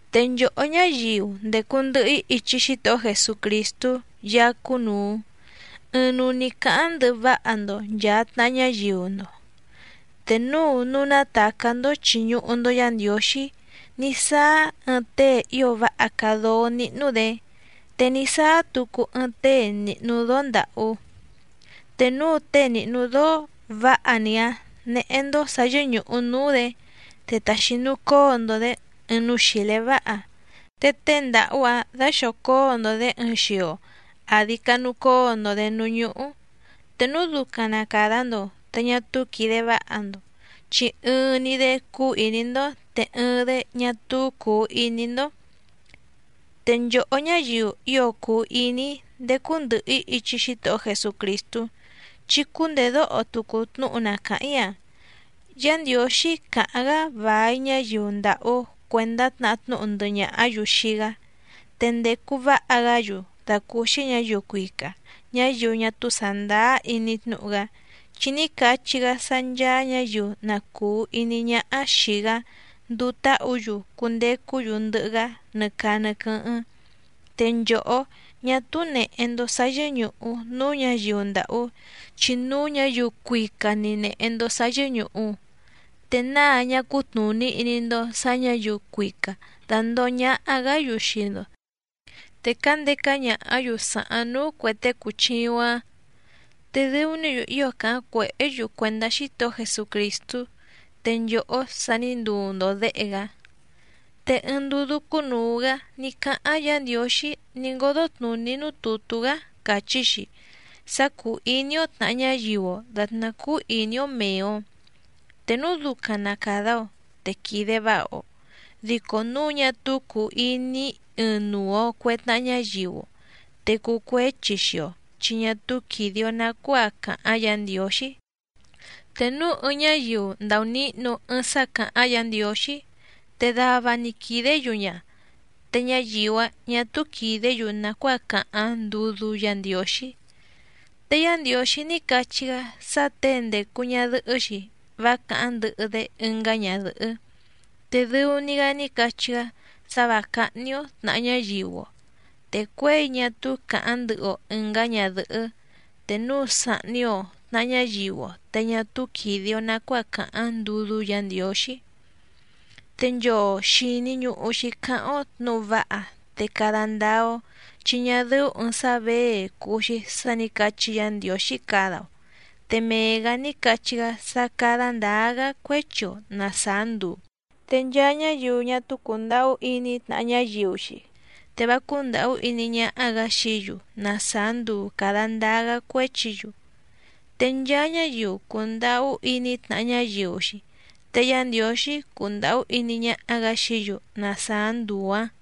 Te nchòhó ñáyiu ndècu ndɨhɨ‑í ichi Xítohó Jesucrìstú Yaá cúnùu, ɨɨⁿnuu‑ni cǎháⁿ ndɨhɨ váha‑ndo nchàa tnaha ñáyiu‑ndo. Te núu núú nátàcá‑ndó chìñuhu‑ndo Yá Ndiǒxí ní sáá ɨɨⁿ tée ío váha càa dóó níhnú‑dě, te ní sáá tucu ɨɨⁿ tée nìhnu dóó ndàhú, te núu tée nìhnu dóó vǎha‑ni‑áⁿ néhé‑ndó sǎ yɨ́ñùhu núú‑dě, te taxinucóo‑ndo‑dě ɨɨⁿ núú xìlé váha, te tée ndàhú‑áⁿ daxòcóo‑ndo‑dě ɨɨⁿ xio àdi canucóo‑ndo‑dě núú ñúhú, te núu ducaⁿ na càda‑ndo te ñá túú quìde váha‑ndo. Chi ɨɨⁿ‑ni‑dé cúú ìní‑ndó, te ɨɨⁿ‑dé ñá túú cùu iní‑ndó. Te nchòhó ñáyiu ío cùu iní‑í ndécú ndɨ̀hɨ‑í ichi Xítohó Jesucrìstú, chí cúndèdóho tucu tnúhu na càháⁿ‑í‑a. Yá Ndiǒxí càháⁿ‑gá vài ñáyiu ndàhú cuèndá tnahá tnúhu ndɨhɨ ñàhá‑yu xii‑gá, te ndècu váha‑gá‑yu dàcúúxí ñǎyiu cuica ñáyiu ñá túú sàndáá iní tnúhu‑gá, chi ní cachí‑gá sá ncháá ñǎyiu na cùu iní ñáhá xìi‑gá nduu táhǔ‑yu cundecú‑yu ndɨhɨ‑gá nɨ caa nɨ quɨ́hɨ́ⁿ. Te nchòhó, ñá túú nèhe‑ndo sá yɨ́ñùhu núú ñǎyiu ndàhú, chi núú ñǎyiu cuica‑ni nèhe‑ndo sá yɨ́ñùhu. ¿Te náa ñá cútnùní iní‑ndó sǎ ñǎyiu cuica dàndoho ñaha‑gá‑yu xii‑ndo, te cǎndeca ñàhá‑yu sàháⁿ núú cuè tée cùchiuⁿ‑áⁿ? Te dɨu‑ní‑yu ío càháⁿ cuèhé‑yu cuèndá Xítohó Jesucrìstú, te nchòhó sa ní nduu‑ndo děhe‑gá. Te ɨɨⁿ ndudú cúnùu‑gá ní cáháⁿ Yǎ Ndiǒxí ní ngódó tnùní núú tùtú‑gá càchí‑xi sá cúú ìní‑ó tnàha ñáyiu‑o dàtná cúú ìní‑ó mèe‑o. Te núu ducaⁿ na càda‑o te quìde váha‑o. Dico núu ñá túú cùu iní ɨɨⁿnuu‑o cuè tnaha ñáyiu‑o, te cuu cuéchi xii‑o chi ñá túú quìde‑o nacuáa càháⁿ Yǎ Ndiǒxí. Te núu ɨɨⁿ ñáyiu ndàunihnu ɨɨⁿ sá càháⁿ Yǎ Ndiǒxí, te dava‑ni quìdé‑yu ña, te ñáyiu‑áⁿ ñà túú quìdé‑yu nàcuáa càháⁿ ndudú Yǎ Ndiǒxí. Te Yá Ndiǒxí ní cachí‑gá sá těe ndècu ñadɨhɨ́‑xi vá càháⁿ ndɨhɨ‑dé ɨngá ñadɨ̀hɨ́. Te dɨu‑ni‑gá ní cachí‑gá sá vǎ cáhní‑ó tnàha ñáyiu‑o. Te cuěi ñá túú càháⁿ ndɨhɨ‑o ɨ̀ngá ñadɨ̀hɨ́, te núu sàhni‑o tnaha ñáyiu‑o te ñá túú quìde‑o nacuáa càháⁿ ndudú Yǎ Ndiǒxí. Te nchoo xìni ñuhu‑xi cáháⁿ‑ó tnǔhu váha te cada ndáá‑ó, chi ñá dɨ́ú ɨ̀ɨⁿ sá věe cùu‑xi sá nǐ cachí Yǎ Ndiǒxí cada‑o. Te mee‑gǎ ní cachí‑gá sá cádá ndǎá‑gá cuéchi‑o na sàá nduu. Te nchaa ñáyiu ñá túú cùndahú iní tnàha ñáyiu‑xi, te vá cúndàhú iní ñáhá‑gǎ xií‑yu na sàá nduu càda ndáá‑gá cuéchi‑yu. Te nchaa ñáyiu cùndahú iní tnàha ñáyiu‑xi te Yá Ndiǒxí cundàhú iní ñáhá‑gǎ xií‑yu na sàá nduu‑ǎⁿ.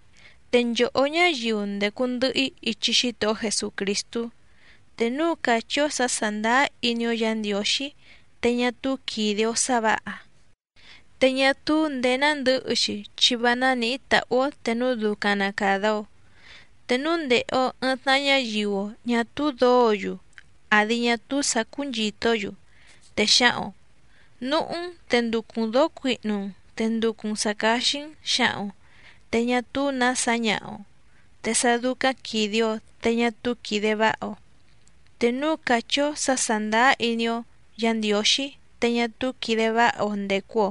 Te nchòhó ñáyiu ndècu ndɨhɨ‑í ichi Xítohó Jesucrìstú, te núu càchí‑ó sǎ sàndáá iní‑ó Yǎ Ndiǒxí te ñá túú quìde‑o sá vǎha, te ñá túú ndèé nándɨ̌hɨ‑xi, chi vá nánìhí tàhú‑ó te núu ducaⁿ na càda‑o. Te núu ndèhe‑o ɨɨⁿ tnaha ñáyiu‑o ñà túú dǒǒ‑yu àdi ñá túú sǎ cúnchìtó‑yu, te xǎhaⁿ‑o: “Núhú‑n te nducu‑n dǒó cuihnu‑n te nducu‑n sǎ cáxí‑n”, xǎhaⁿ‑o, te ñá túú nǎ sǎñaha‑o, te sá dúcáⁿ quìde‑o te ñá túú quìde váha‑o. Te núu càchí‑ó sǎ sàndáá iní‑ó Yǎ Ndiǒxí te ñá túú quìde váha‑o ndècu‑o,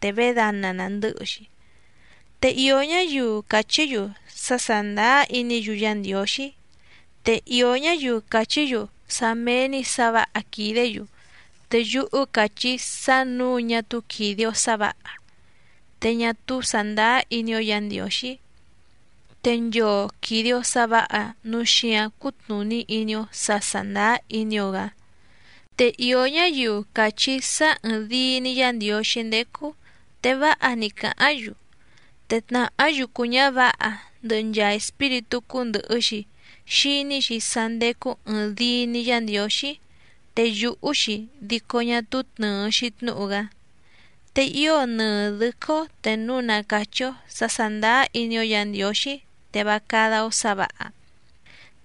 te vědana nàndɨ́hɨ‑xi. Te ìó ñáyiu càchí‑yu sá sàndáá iní‑yu Yá Ndiǒxí, te ìó ñáyiu càchí‑yu sá méé‑ní sǎ vǎha quìdé‑yu. Te yúhú càchí‑í sá nǔu ñá túú quìde‑o sá vǎha, te ñá túú sàndáá iní‑ó Yǎ Ndiǒxí. Te nchoo quìde‑o sá vǎha núu xíǎⁿ cútnùní iní‑ó sǎ sàndáá iní‑ó‑gǎ. Te ìó ñáyiu càchí sá ɨ̀ɨⁿdii‑ni Yá Ndiǒxí ndécú, te váha‑ni càháⁿ‑yu. Te tnàhá yucu ñǎvǎha ndɨhɨ nchaa espíritú cúndɨ̀hɨ‑xi xiní‑xi sá ndécú ɨ̀ɨⁿdii‑ni Yá Ndiǒxí, te yùhú‑xi dico ñá túú tnɨ̀ɨ‑xi tnúhu‑gá. Te ío nɨɨ dɨ̌quɨ́‑ó te núu na càchí‑ó sǎ sàndáá iní‑ó Yǎ Ndiǒxí, te vá cádá‑ó sǎ vǎha.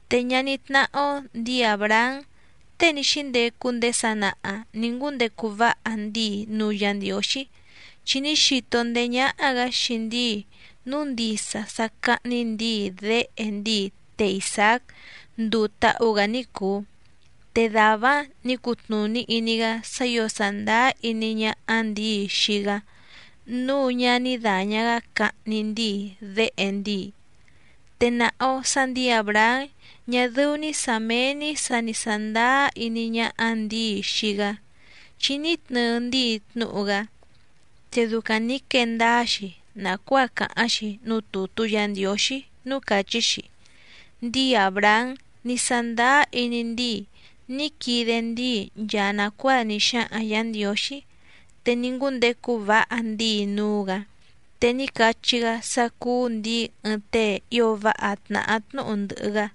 Te ñaní tnáhá‑ó ndǐi Àbrahám tée ní xíndecu ndéé sanaha nǐ ngúndecu váha ndíi núú Yǎ Ndiǒxí, chi ní xito ndéé ñáhá‑gǎ xii ndíi núu ndisa sá cáhní ndǐi déhe ndíi té Isàác nduu táhú‑gǎ ní cùu, te dàvá‑áⁿ nǐ cutnùní iní‑gá sá ǐo sàndáá iní ñáhá ndǐi xii‑gá, núu ñá ní dàña‑gá cahni ndíi déhe ndíi. Te nàha‑o sá ndǐi Àbrahám ñá dɨ́ú‑ní sǎ méé‑ní sǎ ni sàndáá iní ñáhá ndǐi xii‑gá, chi ní tnɨɨ ndíi tnúhu‑gá. Te ducaⁿ nǐ quee ndáá‑xi nàcuáa càháⁿ‑xi núú tùtú Yǎ Ndiǒxí núú càchí‑xi: “Ndíi Àbrahám ní sándáá iní ndíi ní quide ndíi nchaa nàcuáa ní xáhaⁿ Yǎ Ndiǒxí, te ní ngúndecu váha ndíi núú‑gǎ, te ní cachí‑gá sá cúú ndǐi ɨɨⁿ tée ío váha tnàhá tnúhu ndɨhɨ‑gá”,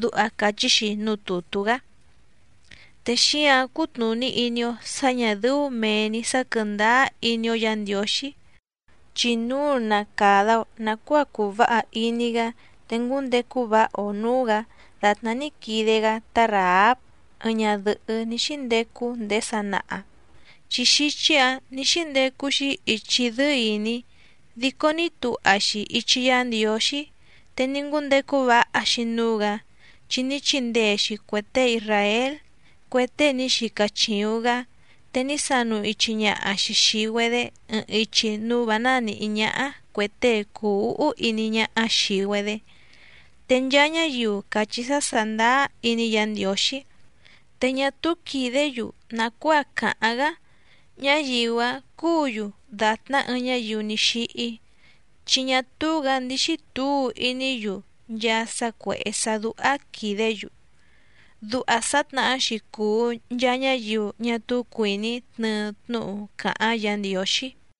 duha càchí‑xi núú tùtú‑gá. Te xíǎⁿ cútnùní iní‑ó sǎ ñà dɨ́ú mèe‑ni sá quɨ̀ndáá iní‑ó Yǎ Ndiǒxí, chi núu na càda‑o nacuáa cuu váha iní‑gá te ngúndecu váha‑o nǔú‑gǎ dàtná ní quide‑gá tá Ràháb ɨɨⁿ ñadɨ̀hɨ́ ní xíndecu ndéé sanaha, chi xíchí‑ǎⁿ nǐ xíndecu‑xi ichi dɨ́ɨ́ ìní, dico ní tuha‑xi ichi Yá Ndiǒxí te ní ngúndecu váha‑xi núú‑gǎ, chi ní chindee‑xi cuè tée isràél cue tée ní xica chìuⁿ‑gá, te ní sanu ichi ñaha‑xi xìi‑güedé ɨɨⁿ ichi núú vǎ nánìhí ñáhá cuè tée cùu úhú iní ñáhá xìi‑güedé. Te nchaa ñáyiu càchí sá sàndáá iní Yǎ Ndiǒxí, te ñá túú quìdé‑yu nàcuáa càháⁿ‑gá ñáyiu‑áⁿ cúǔ‑yu dàtná ɨɨⁿ ñáyiu ní xíhí. Chi ñá túú‑gǎ ndíxí tǔu iní‑yu nchaa sá cuèhé sá dúhá quìdé‑yu. Duha sǎtnahá‑xi cùu nchaa ñáyiu ñá túú cuìní tnɨɨ tnúhu càháⁿ Yǎ Ndiǒxí.